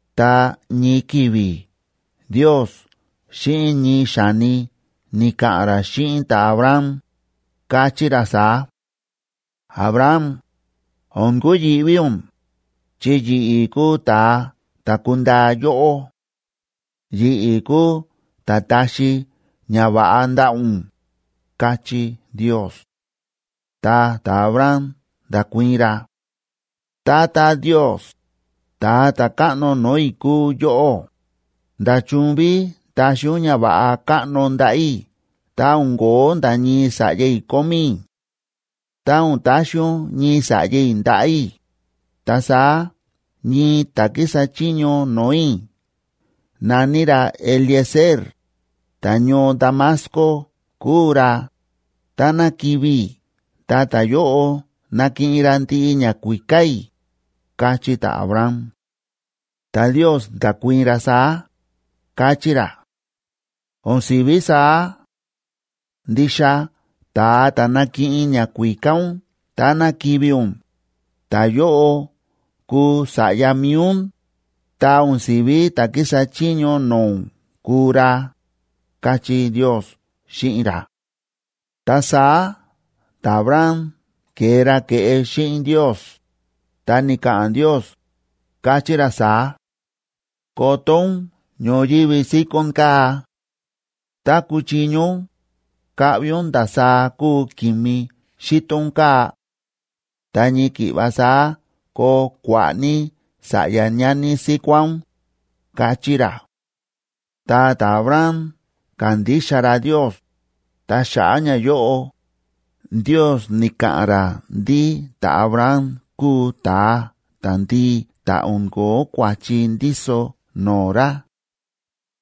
Ta ñii ki̱vi̱ Ndiosa xíꞌin ñii xa̱ni ni̱ka̱ꞌa̱n ra xíꞌin ta̱Abram, káchí ra saá: Abram, o̱n kuyi̱ꞌví ún, chi yi̱ꞌi̱ kúu ta̱a ta̱ kundaa yóꞌó. Yi̱ꞌi̱ kúu ta̱ taxi ñava̱ꞌa ndaꞌa̱ ún, káchí Ndios. Ta ta̱Abram nda̱kuii̱n ra: ―Tata Ndios, Ta̱a ta̱Káꞌno no̱o̱ i̱ kúu yóꞌó, ¿nda̱chun ví taxi ún ñava̱ꞌa káꞌno ndaꞌa̱ i̱ tá o̱n ko̱ó nda̱ ñii sa̱ꞌya i̱ kómí i̱? Tá o̱n taxi ún ñii sa̱ꞌya i̱ ndaꞌa̱ i̱, ta saá ñii ta̱ kísa chiño no̱o̱ i̱ na̱ní ra Eliezer, ta̱ñoo Damasco kúu ra, táná kivi̱ i̱ ta ta̱yóꞌo nakiꞌin ra ndiꞌi ñakuíká i̱ ―káchí ta̱Abram. Ta Ndios nda̱kuii̱n ra saá, káchí ra: ―¡O̱n si̱ví saá! Ndixa ta̱a ta̱ nakiꞌin ñakuíká ún táná kivi̱ ún, ta̱yóꞌo kuu sa̱ꞌya mi̱i ún, ta o̱n sívi ta̱ kísa chiño no̱o̱ ún kuu ra ―káchí Ndios xíꞌin ra. Ta saá ta̱Abram ke̱e ra ke̱ꞌe xíꞌin Ndios, ta ni̱ka̱ꞌa̱n Ndios, káchí ra saá: ―Koto ún ñoyívi síkón kaa̱. Tá kuchiño ún, kaꞌvi ún ndasaá kúu ki̱mi xíto ún kaa̱. Ta ñii ki̱ꞌva saá koo kua̱ꞌa̱ ní sa̱ꞌya ñani síkuá ún ―káchí ra. Ta ta̱Abram ka̱ndixa ra Ndios, ta xa̱ꞌa̱ ñayóꞌo, Ndios ni̱ka̱ꞌa̱n ra ndí ta̱Abram kúu ta̱a ta̱ndii ta̱ o̱n ko̱ó kua̱chi ndíso no̱o̱ ra.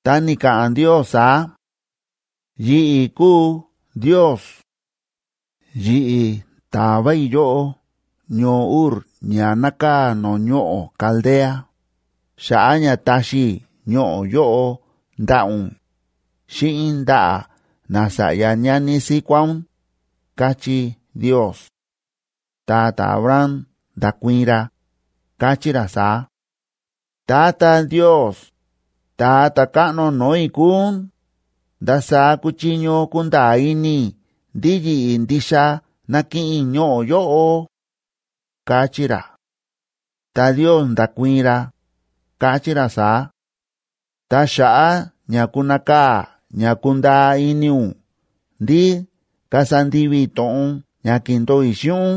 Ta ni̱ka̱ꞌa̱n Ndios saá: ―Yi̱ꞌi̱ kúu Ndios. Yi̱ꞌi̱ ta̱va i̱ yóꞌó ñoo Ur ña nákaa̱ no̱o̱ ñoꞌo̱ Caldea, xa̱ꞌa̱ ña taxi i̱ ñoꞌo̱ yóꞌo ndaꞌa̱ ún, xíꞌin ndaꞌa̱ nasa̱ꞌya ñani síkuá ún ―káchí Ndios. Ta ta̱Abram nda̱kuii̱n ra, káchí ra saá: ―Tata Ndios, ta̱a ta̱káꞌno no̱o̱ i̱ kúu ún, ¿ndasaá kuchiño kunda̱a̱ ini i̱ ndí yi̱ꞌi̱ ndixa nakiꞌin i̱ ñoꞌo̱ yóꞌo? ―káchí ra. Ta Ndios nda̱kuii̱n ra, káchí ra saá: ―Ta xa̱ꞌa̱ ña kunakaa̱ ña kundaa ini ún ndí kasa ndivi i̱ to̱ꞌon ña ki̱ndo̱o i̱ xíꞌin ún,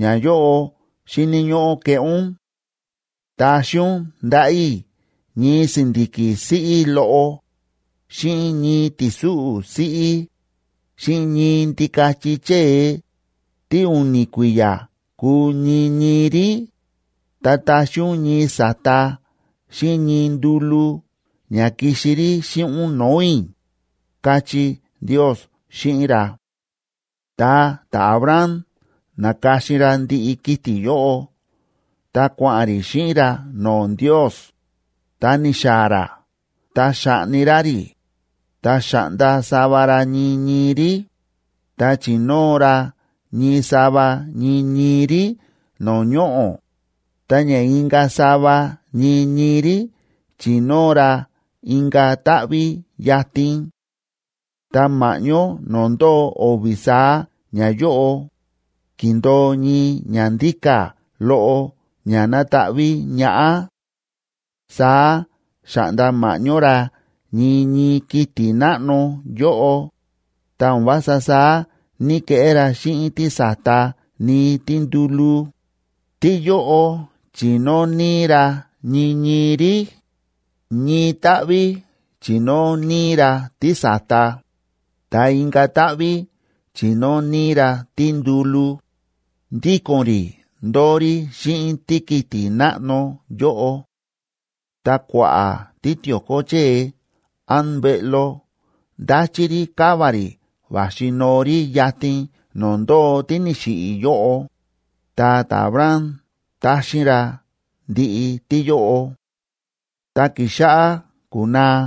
ñayóꞌo xíni̱ ñóꞌó keꞌé ún. Taxi ún ndaꞌa̱ i̱ ñii si̱ndi̱ki̱ siꞌí loꞌo, xíꞌin ñii ti̱súꞌu̱ siꞌí, xíꞌin ñii ndikachi chée, tí u̱ni̱ kui̱ya̱ kúu ñii ñii rí, ta taxi ún ñii sa̱ta xíꞌin ñii ndúlú ña kixi rí xíꞌin ún no̱o̱ i̱ ―káchí Ndios xíꞌin ra. Ta ta̱Abram na̱ka̱xin ra ndiꞌi kiti̱ yóꞌo ta kua̱ꞌa̱n rí xíꞌin ra no̱o̱ Ndios, ta ni̱xaa̱ ra ta xa̱ꞌni ra rí, ta xa̱ꞌnda sava ra ñii ñii rí, ta chi̱nóo ra ñii sava ñii ñii rí no̱o̱ ñoꞌo̱, ta ña inka̱ sava ñii ñii rí chi̱nóo ra inka̱ táꞌví yatin. Ta ma̱ꞌñó no̱o̱ ndóo o̱vi̱ saá ñayóꞌo, ki̱ndo̱o ñii ñandíka̱ loꞌo ña na̱taꞌví ñaꞌá. Saá xa̱ꞌnda ma̱ꞌñó ra ñii ñii kiti̱ náꞌno yóꞌo, ta o̱n vása saá ní‑keꞌé ra xíꞌin tísa̱ta ni tíndúlú, tíyóꞌo chi̱nóo níí ra ñii ñii rí, ñii táꞌví chi̱nóo níí ra tísa̱ta, ta inka̱ táꞌví chi̱nóo níí ra tíndúlú, ndíko̱n rí ndóo rí xíꞌin tíkiti̱ náꞌno yóꞌo. Ta kua̱ꞌa̱ títio̱ko chée án mbeꞌlo ndáchí rí káva rí va̱xi noo rí yatin no̱o̱ ndóo tí ni̱xiꞌi̱ yóꞌo, ta ta̱Abram táxín ra ndiꞌi tíyóꞌo. Ta ki̱xáꞌá kúnaa,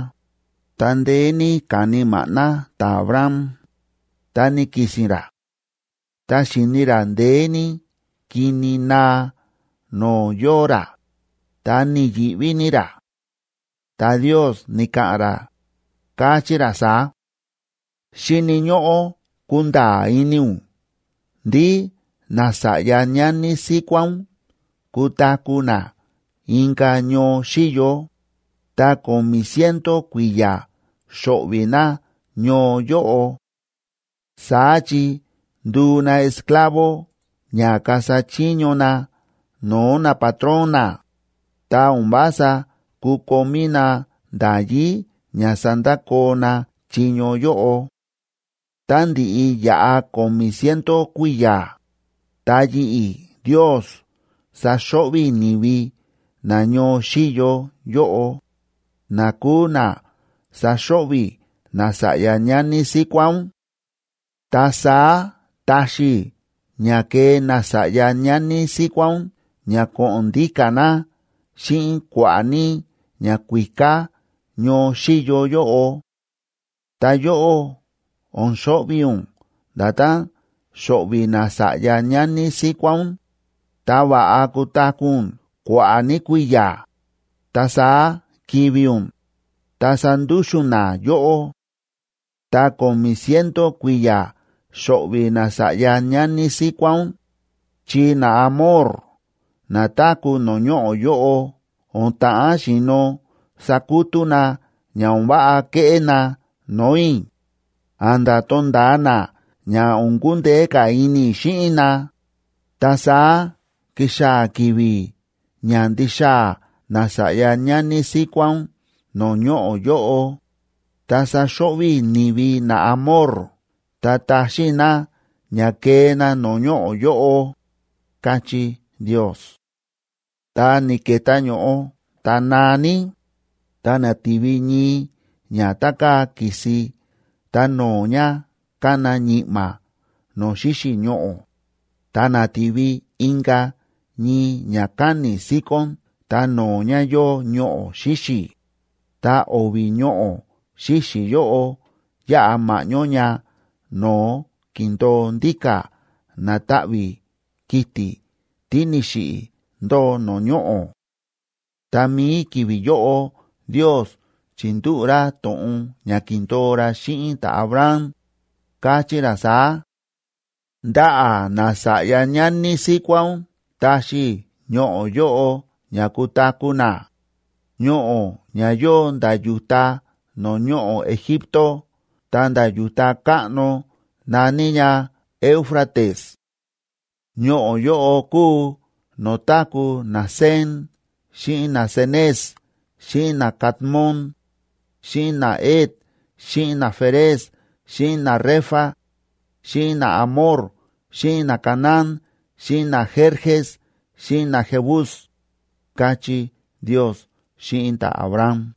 ta ndeé ní ka̱ni maꞌná ta̱Abram, ta ni̱ki̱si̱n ra. Ta xi̱ni ra ndeé ní kini naa no̱o̱ yóo ra, ta ni̱yi̱ꞌví ní ra. Ta Ndios ni̱ka̱ꞌa̱n ra, káchí ra saá: Xíni̱ ñóꞌó kunda̱a̱ ini ún ndí nasa̱ꞌya ñani síkuá ún kutaku̱ na inka̱ ñoo xíyo, ta ko̱mi̱ ciento kui̱ya̱ xo̱ꞌvi̱ na ñoo yóꞌo. Saá chi nduu na esclavo ña kasa chiño na no̱o̱ napatrón na, ta o̱n vása kukomí na nda̱yí ña sandakoo na chiño yóꞌo. Tá ndiꞌi yaꞌa ko̱mi̱ ciento kui̱ya̱, ta yi̱ꞌi̱ Ndios saxo̱ꞌvi̱ i̱ ni̱vi na ñoo xíyo yóꞌo, na kuu na saxo̱ꞌvi̱ nasa̱ꞌya ñani síkuá ún. Ta saá taxi i̱ ña kee nasa̱ꞌya ñani síkuá ún ña ko̱ꞌo̱n ndíka̱ na xíꞌin kua̱ꞌa̱ ní ñakuíká ñoo xíyo yóꞌo. Ta yóꞌó, o̱n xo̱ꞌvi̱ ún nda̱tán xo̱ꞌvi̱ nasa̱ꞌya ñani síkuá ún, ta va̱ꞌa kutaku̱ ún kua̱ꞌa̱ ní kui̱ya̱, ta saá kivi̱ ún, ta sandúxu̱n na yóꞌó. Ta ko̱mi̱ ciento kui̱ya̱ xo̱ꞌvi̱ nasa̱ꞌya ñani síkuá ún, chi naAmor na táku̱ no̱o̱ ñoꞌo̱ yóꞌo o̱n ta̱ꞌán xi̱no̱ sakutú na ña o̱n váꞌa keꞌé na no̱o̱ i̱, a̱nda̱ to̱nda̱a na ña o̱n kundeé ka̱ ini i̱ xíꞌin na, ta saá kixaa̱ ki̱vi̱ ña ndixaa̱ nasa̱ꞌya ñani síkuá ún no̱o̱ ñoꞌo̱ yóꞌo, ta saxo̱ꞌvi̱ i̱ ni̱vi naAmor ta taxín i̱ na ña kee na no̱o̱ ñoꞌo̱ yóꞌo, káchí Ndios. Ta ni̱ke̱tá ño̱ꞌo ta naa ní, ta na̱ti̱vi ñii ña tá káa ki̱si ta no̱o̱ ña kána ñi̱ꞌma̱ no̱o̱ xíxi̱ ñoꞌo̱, ta na̱ti̱vi inka̱ ñii ñakáni̱ síkón ta no̱o̱ ña yóo ñoꞌo̱ xíxi̱, ta o̱vi̱ ñoꞌo̱ xíxi̱ yóꞌo yáꞌa ma̱ꞌñó ña no̱o̱ ki̱ndo̱o ndíka̱ na̱taꞌví kiti̱ tí ni̱xiꞌi̱ ndóo no̱o̱ ñoꞌo̱. Tá mií ki̱vi̱ yóꞌo Ndios chi̱ndúꞌu̱ ra to̱ꞌon ña ki̱ndo̱o ra xíꞌin ta̱Abram, káchí ra saá: Ndaꞌa̱ nasa̱ꞌya ñani síkuá ún taxi i̱ ñoꞌo̱ yóꞌo ña kutaku̱ na, ñoꞌo̱ ña yóo nda̱ yu̱ta no̱o̱ ñoꞌo̱ Egipto ta̱nda̱ yu̱ta káꞌno na̱ní ña Éufrates. Ñoꞌo̱ yóꞌo kúu no̱o̱ táku̱ naCen xíꞌin naCenez xíꞌin naCadmon, xíꞌin naHet xíꞌin naFerez xíꞌin naRefa, xíꞌin naAmor xíꞌin naCanaán xíꞌin naGerges xíꞌin naJebus, káchí Ndios xíꞌin ta̱Abram.